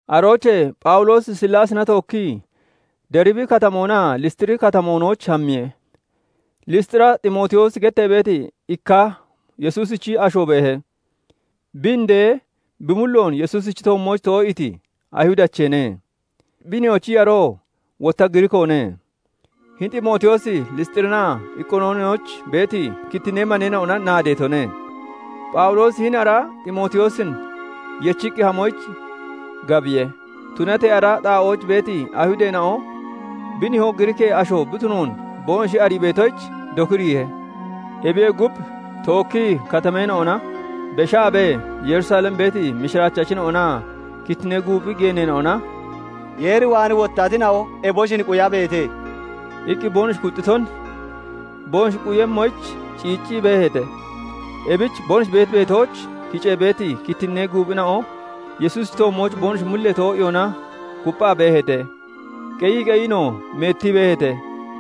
Aroochee Phawuloosi Sillaasina tookkii Deribi Katamoonaa Lisxiri Katamoonooch hammiye. Lisxira Ximootiyoosi gettee beeti ikka Yesuusichi asho beehe. Bi indee bi mulloon Yesuusichi toommooch too'iiti Ayihudacheene; bi nihoochi yaroo wotta Giriikoone. Hini Ximootiyoosi Lisxirinaa Iqooniyooninooch beeti kittinnee maneena'ona naadeetone. Phawuloosi hini ara Ximootiyoosin yechiqqi hamoyich gabiye. Tunatee ara xaa'ooch beeti Ayihudeena'o bi nihoo Giriikee asho bi tunoon boonoshi arii beetoyich dokiriihe. Ebiyee gub, tookkii katameena'ona beshaabee, Yerusalem beeti mishiraachachina'onaa kittinnee guuphi geeneena'ona "Yeer waan wottatina'o eboshin quyabeete" iqqi boonoshi kuxxiton boonoshi quyemmoyich ciiccii beeheete. Ebich boonoshi beeti beetooch kicee beeti kittinnee guuphina'o Yesuusichi toommooch boonoshi mullee too'iyoona kupphaa beeheete. Qeyii qeyiinoo meettii beeheete.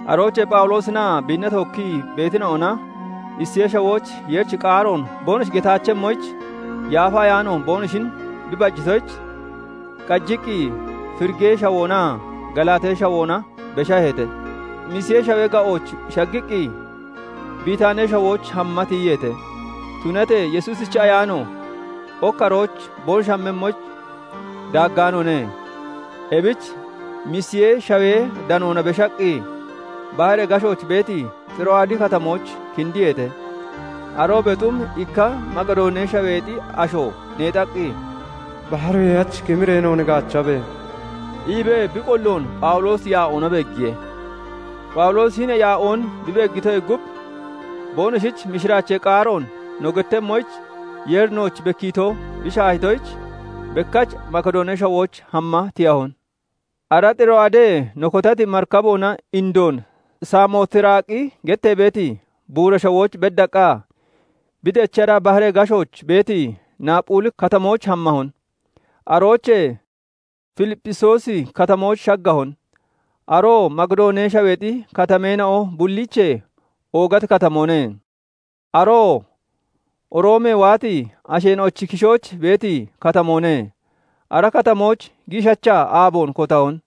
Aroochee Phawuloosinaa biinna tookkii beetina'ona Isiyee Shawooch Yeerichi qaaroon boonoshi getaachemmoyich, Yaafa Ayaano boonoshin bi bajitoyich, qajiqqi Firigee Shawoonaa Galaatee Shawoona beshaheete. Misiyee Shawee ga'ooch shaggiqqi, Bitaanee Shawooch hama tiyiyeete; tunatee Yesuusichi Ayaano ok arooch boonoshi hammemmoyich daaggaanoone. Ebich Misiyee Shawee danoona beshaqqi baharee gashooch beeti Xiro'aadi Katamooch kindiyeete. Aroobee xum ikka Makidoonee Shaweexi asho neexaqqi, "Baharoyee hach kimiree noon gaachabe!" iibee bi qolloon Phawuloosi yaa'oona beeggiye. Phawuloosi hini yaa'oon bi beeggitoyee gub, boonoshich mishiraachee qaaroon no gettemmoyich Yeeri nooch bekkiito bi shaahitoyich, bekkach Makidoonee Shawooch hamma tiyahon. Ara Xiro'aadee no kotati marikaboona indoon Samootiraaqi gettee beeti buura shawooch beddaqqa, bi dechara baharee gashooch beeti Naphuli Katamooch hammahon. Aroochee Filippisiyoosi Katamooch shaggahon; aroo Makidoonee Shaweexi katameena'o bulliichee oogati katamoone; aroo Roomee waati asheena'ochi kishooch beeti katamoone. Ara katamooch giishacha aaboon kotahon.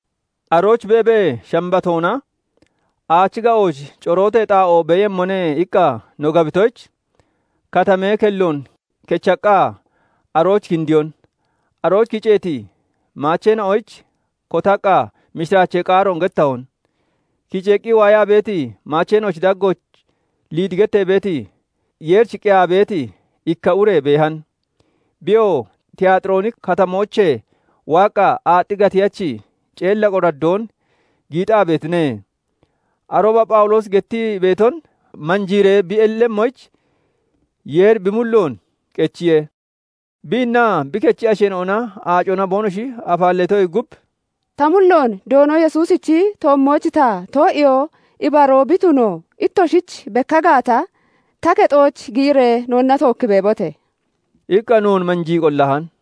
Arooch beebee, Shambatoona "Aachi ga'ooch corootee xaa'oo beeyemmone" iqqa no gabitoyich, katamee kelloon kechaqqa arooch kindiyon. Arooch kiceeti maacheena'oyich kotaqqa, mishiraachee qaaroon gettahon. Kiceeqqi waayaa beeti maacheena'ochi daggooch Liidi gettee beeti, Yeerich qeyaa beeti ikka ure beehan. Biyoo Tiyaaxirooni Katamoochee waaqqa, aaxxi gatiyachi ceella qoraddoon giixaa beetine. Arooba Phawuloosi gettii beeton manjiiree bi ellemmoyich, Yeeri bi mulloon qechiye. Biinnaa bi kechi asheena'ona aacona boonoshi afaalleetoyee gub, "Ta mulloon Doono Yesuusichi toommooch ta too'iyoo ibaroo bi tuno ittoshich bekka gaata, ta kexooch giyiree noonna tookki beebote!" iqqa noon manjii qollahan.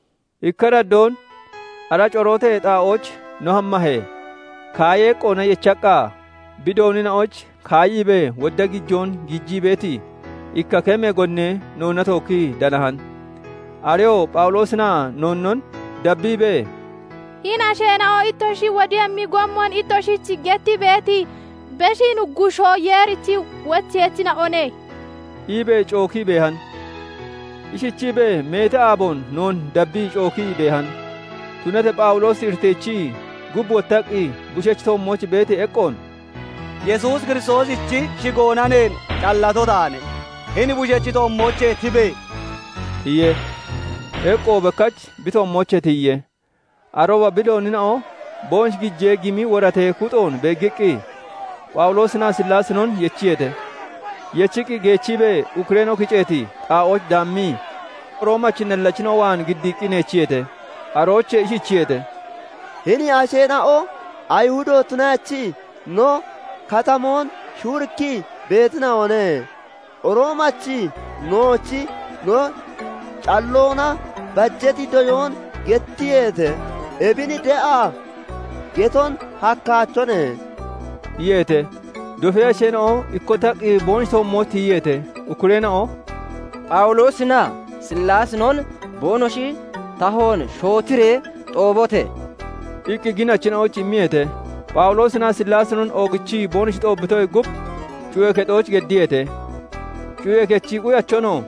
Ikka araddoon ara corootee xaa'ooch no hammahee, kaayee eqqoona yecheeqqa, bi doonina'oyich kaayiibee wodda gijoon giijii beeti, ikka kemee gonnee noonna tookkii danahan. Areyoo Phawuloosinaa noonnon dabbiibee, "Hini asheena'o ittoshi wodemmi gommon ittoshich gettii beeti Beshi Nuggushoo Yeerichi wocheyachina'one!" iibee cookii beehan. Ishichiibee meeti aaboon noon dabbii cookii beehan. Tunatee Phawuloosi iriteechii, gub wottaqqi, bushechi toommooch beeti eqqoon "Yesuus Kiristoosichi shigoona neen callato taane; hini bushechi toommoochee tibe!" iye. Eqqoo bekkach bi toommoochee tiyiye. Arooba bi doonina'o boonoshi gijee gimi woratee kuxoon beeggiqqi, Phawuloosinaa Sillaasinon yechiyeete. Yechiqqi geechiibee ukkureena'o kiceeti xaa'ooch daammii, Roomachi nallachina'o waan giddiiqqi neechiyeete. Aroochee ishichiyeete:- "Hini asheena'o Ayihudo tunaachii no katamoon shuurikkii beetina'one. Roomachi nooch no calloona bajeeti doyoon gettiyeete; ebin de'a geton hakkaachone" iyeete. Dofee asheena'o ikkottaqqi boonoshi toommooch tiyiyeete. Ukkureena'o "Phawuloosinaa Sillaasinon boonoshi tahoon shootiree xoobote!" iqqi ginachina'oyich immiyeete. Phawuloosinaa Sillaasinon oogichiqqi boonoshi xoobbitoyee gub, cuyee kexooch geddiyeete. Cuyee kechi quyachonoo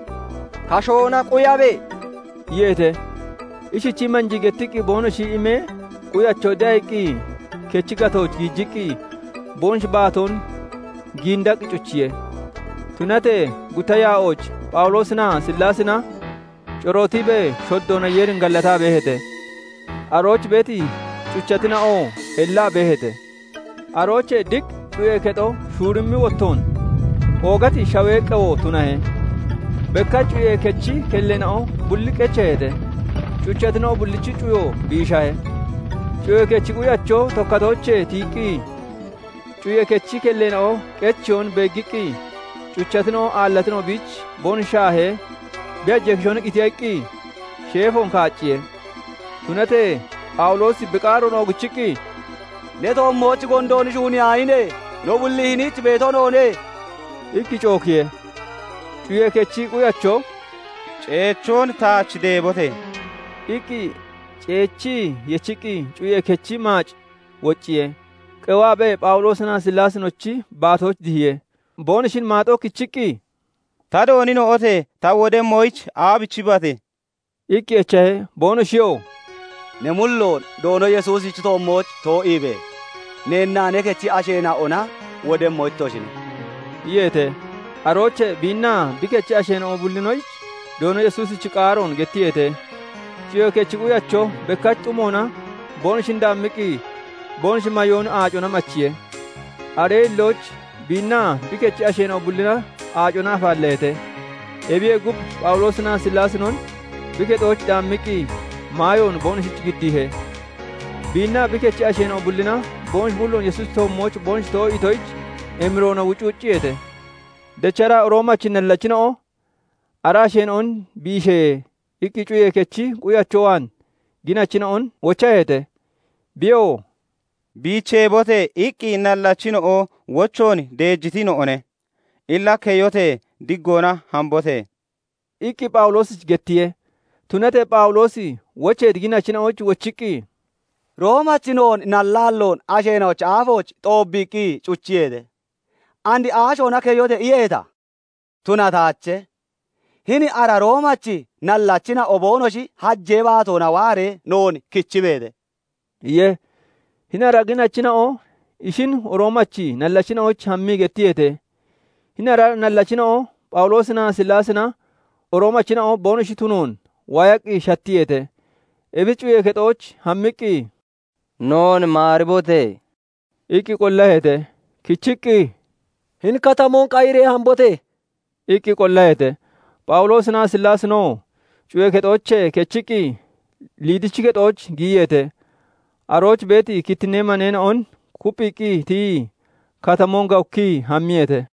"Kashoona quyabe!" iyeete. Ishichii manjii gettiqqi boonoshi imee, quyacho de'a iqqi kechi gatooch giijiqqi, boonoshi baatoon giindaqqi cuchiye. Tunatee gutta yaa'ooch Phawuloosinaa Sillaasina corootiibee shoddoona Yeerin gallataa beeheete; arooch beeti cuchatina'oo ellaa beeheete. Aroochee diq cuyee kexo shuurimmi wottoon, oogati shawee qewo tunahe. Bekkach cuyee kechi kelleena'o bulli qecheeheete; cuchatina'o bullichi cuyo biishahe. Cuyee kechi quyacho tokkatoochee tiyiqqi, cuyee kechi kelleena'o qecheyoon beeggiqqi cuchatina'o aallatina'o biich boonoshi shaahee, bi hajee kishoona qitiya iqqi sheefoon kaacciye. Tunatee Phawuloosi bi qaaroon oogichiqqi, "Ne toommooch gondoon shuuniyaahine! No bulli hiniich beeto noone!" iqqi cookiye. Cuyee kechi quyacho "Ceechoon taach deebote!" iqqi ceechii yechiqqi, cuyee kechi maac wocciye; qewaabee Phawuloosinaa Sillaasinochi baatooch dihiye. Boonoshin maaxooch kichiqqi, "Ta doonina'ote! Ta wodemmoyich aabichibate?" iqqi echahe. Boonoshiyoo "Ne mulloon Doono Yesuusichi toommooch too'iibe! Neennaa ne kechi asheena'ona wodemmo ittoshine" iyeete. Aroochee biinnaa bi kechi asheena'o bullinoyich Doono Yesuusichi qaaroon gettiyeete. Cuyee kechi quyacho bekkach xumoona boonoshin daammiqqi, boonoshi mayoon aacona machiye. Aree hillooch biinnaa bi kechi asheena'o bullina aacona afaalleeheete. Ebiyee gub, Phawuloosinaa Sillaasinon bi kexooch daammiqqi, maayoon boonoshich giddiihe. Biinnaa bi kechi asheena'o bullina boonoshi mulloon Yesuusichi toommooch boonoshi too'iitoyich, emiroona wucwucciyeete. Dechara Roomachi nallachina'o "Ara asheena'on biishe!" iqqi cuyee kechi quyacho waan ginachina'on wochaheete. Biyoo " 'Biicheebote!' iqqi nallachina'o wochoon deejitina'one. Illa keyote! Diggoona hambote!" iqqi Phawuloosich gettiye. Tunatee Phawuloosi wocheeti ginachina'oyich wochiqqi, "Roomachi noon nallaalloon asheena'ochi aafooch xoobbiiqqi cuchiyeete. And aashoona 'Keyote!' iyeeta? Tunataache. Hini ara Roomachi nallachina'o boonoshi hajee baatoona waaree noon kichibeete!" iye. Hini ara ginachina'o ishin Roomachi nallachina'oyich hammii gettiyeete. Hini ara nallachina'o Phawuloosinaa Sillaasina Roomachina'o boonoshi tunoon waayaqqi shattiyeete. Ebich cuyee kexooch hammiqqi, "Noon maaribote!" iqqi qollaheete. Kichiqqi, "Hini katamoon qayiree hambote!" iqqi qollaheete. Phawuloosinaa Sillaasinoo cuyee kexoochee kechiqqi, Liidichi kexooch giyiyeete. Arooch beeti kittinnee maneena'on kupphiiqqi tiyii, katamoon gawukkii hammiyeete.